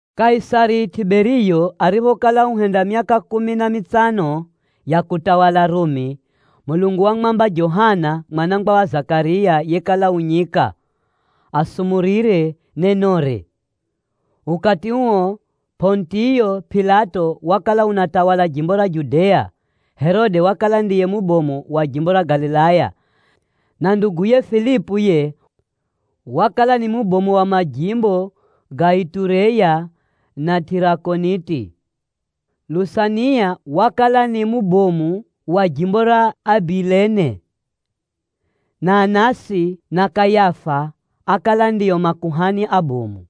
Kaisari Tʼiberiyo ariphokala uhenda myaka kumi na mitsano ya kutawala Rumi, Mulungu wamwamba Johana mwana wa Zakariya yekala u nyika, asumurire nenore. Ukati uo Pʼonitiyo Pilato wakala unatawala jimbo ra Judea, Herode Herode yuyu wakala ni Herode Anitipa. wakala ndiye mubomu wa jimbo ra Galilaya, na nduguye Filipu yiye wakala ni mubomu wa majimbo ga Itureya na Tʼirakoniti. Lusania wakala ni mubomu wa jimbo ra Abilene, na Anasi na Kayafa ákala ndio makuhani abomu.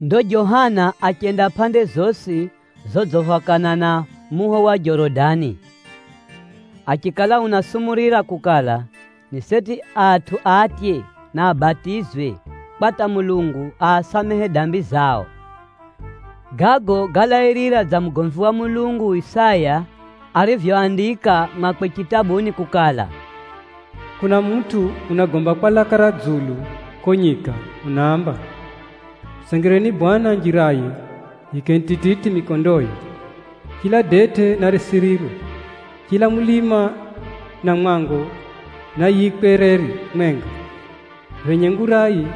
Ndo Johana achenda pʼande zosi zodziphakana na muho wa Jorodani, achikala unasumurira kukala, ni seti atʼu atye na abatizwe, kwa hata Mulungu aasamehe dambi zao. Gago gálairira dza mugomvi wa Mulungu Isaya arivyoandika mwakwe chitabuni kukala, “Kuna mutʼu unagomba kwa laka ra dzulu kuko nyika unaamba: ‘Mutsengereni Bwana Mulungu njiraye, yiikeni tititi mikondoye. Chila detʼe narisirirwe, chila mulima na mwango nayiikwe reri mwenga, phenye ngurai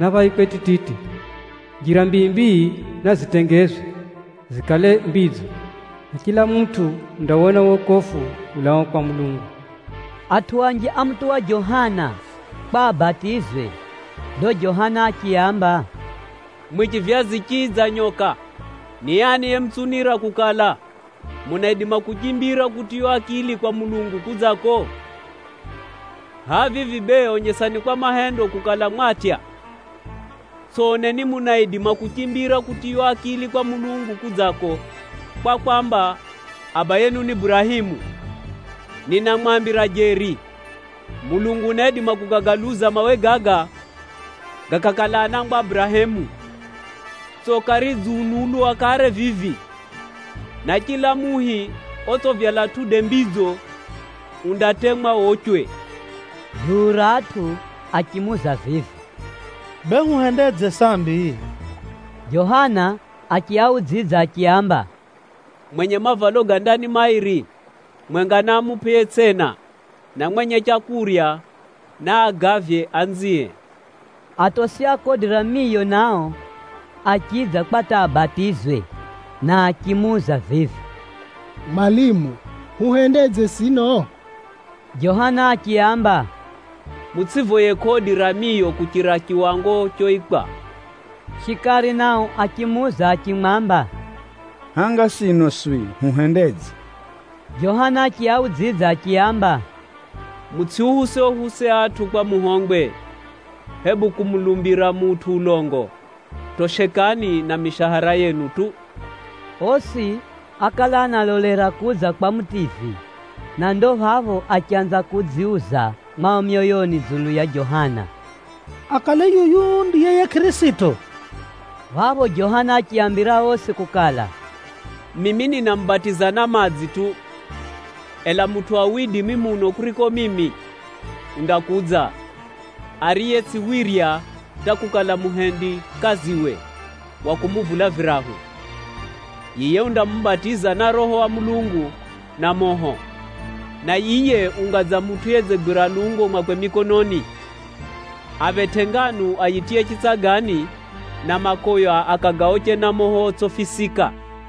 naphaikwe tititi, njira mbii-mbii nazitengezwe zikale mbidzo. Na adamu osi andawona wokofu ulaao kwa Mulungu!’” Atʼu anji ámutuwa Johana kwa abatizwe. Ndo Johana achiaamba, “Mwimwi chivyazi chii dza nyoka! Ni ani yemutsunira kukala, munaidima kuchimbira kutiywa akili kwa Mulungu kudzako? Hʼaya vivi bee onyesani kwa mahendo kukala mwatya. Tsʼoneni munaidima kuchimbira kutiywa akili ni Mulungu kudzako kwa kwamba, ‘Abayehu ni Burahemu.’ Maana ninamwambira kukala, Mulungu unaidima kugagaluza mawe gaga gakakala anangwa a Burahemu. Tsoka ridziunulwa kare vivi, na chila muhi otsʼivyala matunda madzo undatemwa wochwe.” Duu ra atʼu achimuuza vivi, “Bee huhendedze sambi?” Johana achiaudzidza achiaamba, “Mwenye mavalo ga ndani mairi, mwenga naamupʼe yetsʼina, na mwenye leu naagavye anzie.” Atosi a kodi ra miyo nao achidza kwa hata abatizwe, na achimuuza vivi, “Mwalimu, huhendedze sino?” Johana achiaamba, “Mutsʼivoye kodi ra miyo kuchira chiwango choikwa.” Shikari nao achimuuza achimwamba, “Hanga sino swi huhendedze?” Johana achiaudzidza achiaamba, “Mutsʼiuhuse-uhuse atʼu kwa muhongwe, hebu kumulumbira mutʼu ulongo. Toshekani na mishahara yenu tu.” Osi ákala analolera kudza kwa Mutivyi, na ndo phapho achanza kudziuza mwao myoyoni dzulu ya Johana, “Akale yuyu ndiye yiye Kʼirisito?” Phapho Johana achiaambira osi kukala, “Mimi ninamubatiza na madzi tu, ela mutʼu wa widimi muno kuriko mimi, undakudza, ariye tsʼiwirya hata kukala muhendikaziwe wa kumuvula virahu. Yiye undamubatiza na Roho wa Mulungu, na moho. Na yiye unga dza mutʼu yedzigwira lungo mwakwe mikononi, aphetʼe nganu ayitiye chitsagani, na makʼoya akagaoche na moho otsʼifisika.”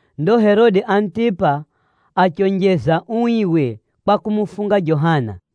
Ndo Herode Anitipa achionjeza uiwe kwa kumufunga Johana.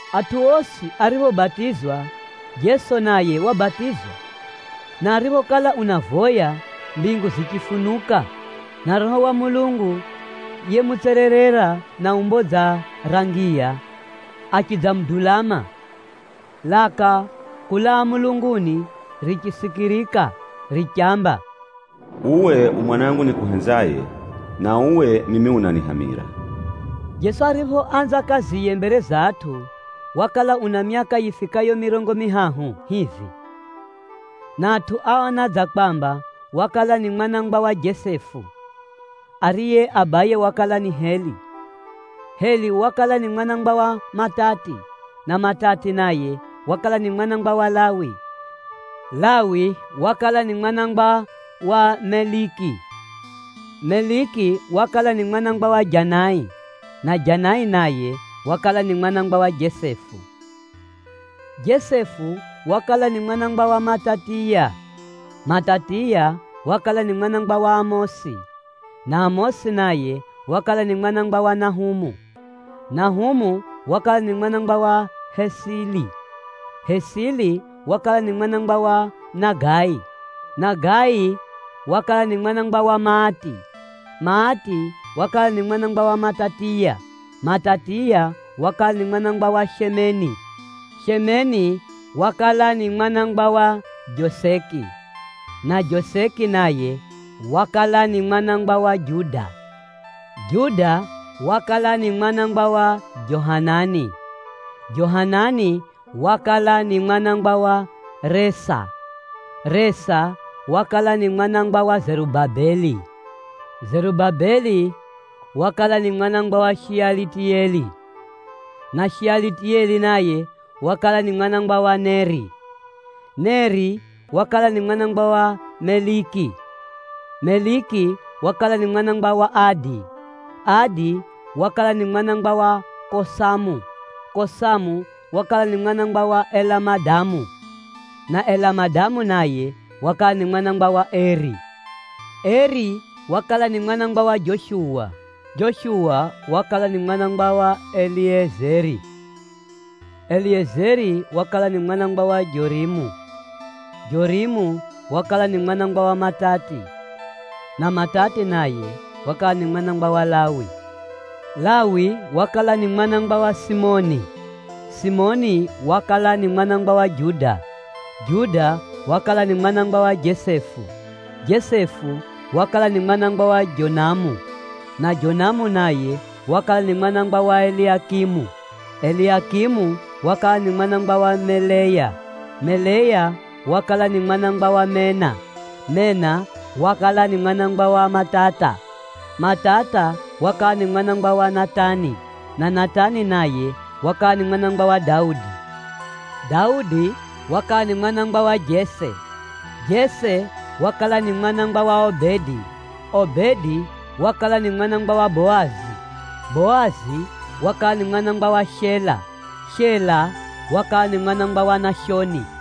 Atʼu osi ariphobatizwa, Jeso naye wabatizwa. Na ariphokala unavoya, mbingu zichifunuka, na Roho wa Mulungu yemutsererera na umbo dza ra ngiya achidzamudulama. Phapho laka kulaa mulunguni richisikirika richamba, “Uwe u Mwanangu nikuhenzaye, na uwe mimi unanihamira.” Jeso ariphoanza kaziye mbere za atʼu, wakala una myaka yifikayo mirongo mihahu hivi, na atʼu áona dza kwamba wakala ni mwana wa Jesefu, ariye abaye wakala ni Heli. Heli wakala ni mwana wa Matati, na Matati naye wakala ni mwana wa Lawi. Lawi wakala ni mwana wa Meliki, Meliki wakala ni mwana wa Janai, na Janai naye wakala ni mwana wa Jesefu. Jesefu wakala ni mwana wa Matatiya, Matatiya wakala ni mwana wa Amosi, na Amosi naye wakala ni mwana wa Nahumu. Nahumu wakala ni mwana wa Hesili, Hesili wakala ni mwana wa Nagai, Nagai wakala ni mwana wa Maati, Maati wakala ni mwana wa Matatiya, Matatiya wakala ni mwana wa Shemeni, Shemeni wakala ni mwana wa Joseki, na Joseki naye wakala ni mwana wa Juda. Juda wakala ni mwana wa Johanani, Johanani wakala ni mwana wa Resa, Resa wakala ni mwana wa Zerubabeli, Zerubabeli wakala ni mwana wa Shealitiyeli, na Shealitiyeli naye wakala ni mwana wa Neri. Neri wakala ni mwana wa Meliki, Meliki wakala ni mwana wa Adi, Adi wakala ni mwana wa Kosamu, Kosamu wakala ni mwana wa Elamadamu, na Elamadamu naye wakala ni mwana wa Eri. Eri wakala ni mwana wa Joshuwa, Joshuwa wakala ni mwana wa Eliyezeri, Eliyezeri wakala ni mwana wa Jorimu, Jorimu wakala ni mwana wa Matati, na Matati naye wakala ni mwana wa Lawi. Lawi wakala ni mwana wa Simioni, Simioni wakala ni mwana wa Juda, Juda wakala ni mwana wa Jesefu, Jesefu wakala ni mwana wa Jonamu, na Jonamu naye wakala ni mwana wa Eliakimu. Eliakimu wakala ni mwana wa Meleya, Meleya wakala ni mwana wa Mena, Mena wakala ni mwana wa Matata, Matata wakala ni mwana wa Natani, na Natani naye wakala ni mwana wa Daudi. Daudi wakala ni mwana wa Jese, Jese wakala ni mwana wa Obedi, Obedi wakala ni mwana wa Boazi, Boazi wakala ni mwana wa Shela, Shela wakala ni mwana wa Nashoni,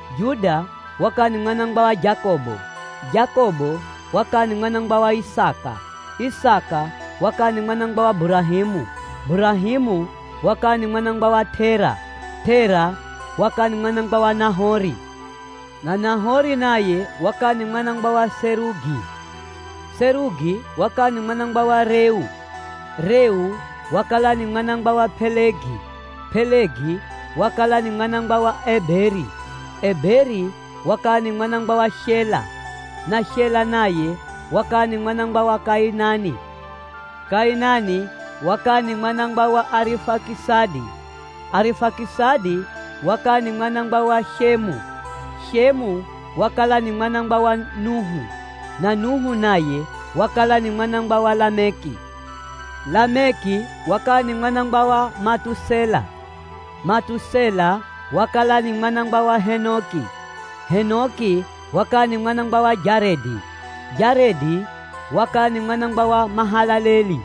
Juda wakala ni mwana wa Jakobo, Jakobo wakala ni mwana wa Isaka, Isaka wakala ni mwana wa Burahemu, Burahemu wakala ni mwana wa Tera, Tera wakala ni mwana wa Nahori, na Nahori naye wakala ni mwana wa Serugi. Serugi wakala ni mwana wa Reu, Reu wakala ni mwana wa Pelegi, Pelegi wakala ni mwana wa Eberi, Eberi wakala ni mwana wa Shela, na Shela naye wakala ni mwana wa Kainani. Kainani wakala ni mwana wa Arifakisadi, Arifakisadi wakala ni mwana wa Shemu, Shemu wakala ni mwana wa Nuhu, na Nuhu naye wakala ni mwana wa Lameki. Lameki wakala ni mwana wa Matusela, Matusela wakala ni mwana wa Henoko, Henoko wakala ni mwana wa Jaredi, Jaredi wakala ni mwana wa Mahalaleli,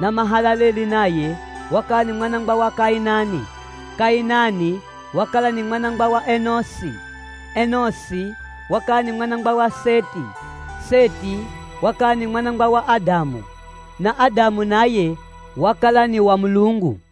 na Mahalaleli naye wakala ni mwana wa Kainani. Kainani wakala ni mwana wa Enoshi, Enoshi wakala ni mwana wa Seti, Seti wakala ni mwana wa Adamu, na Adamu naye wakala ni wa Mulungu.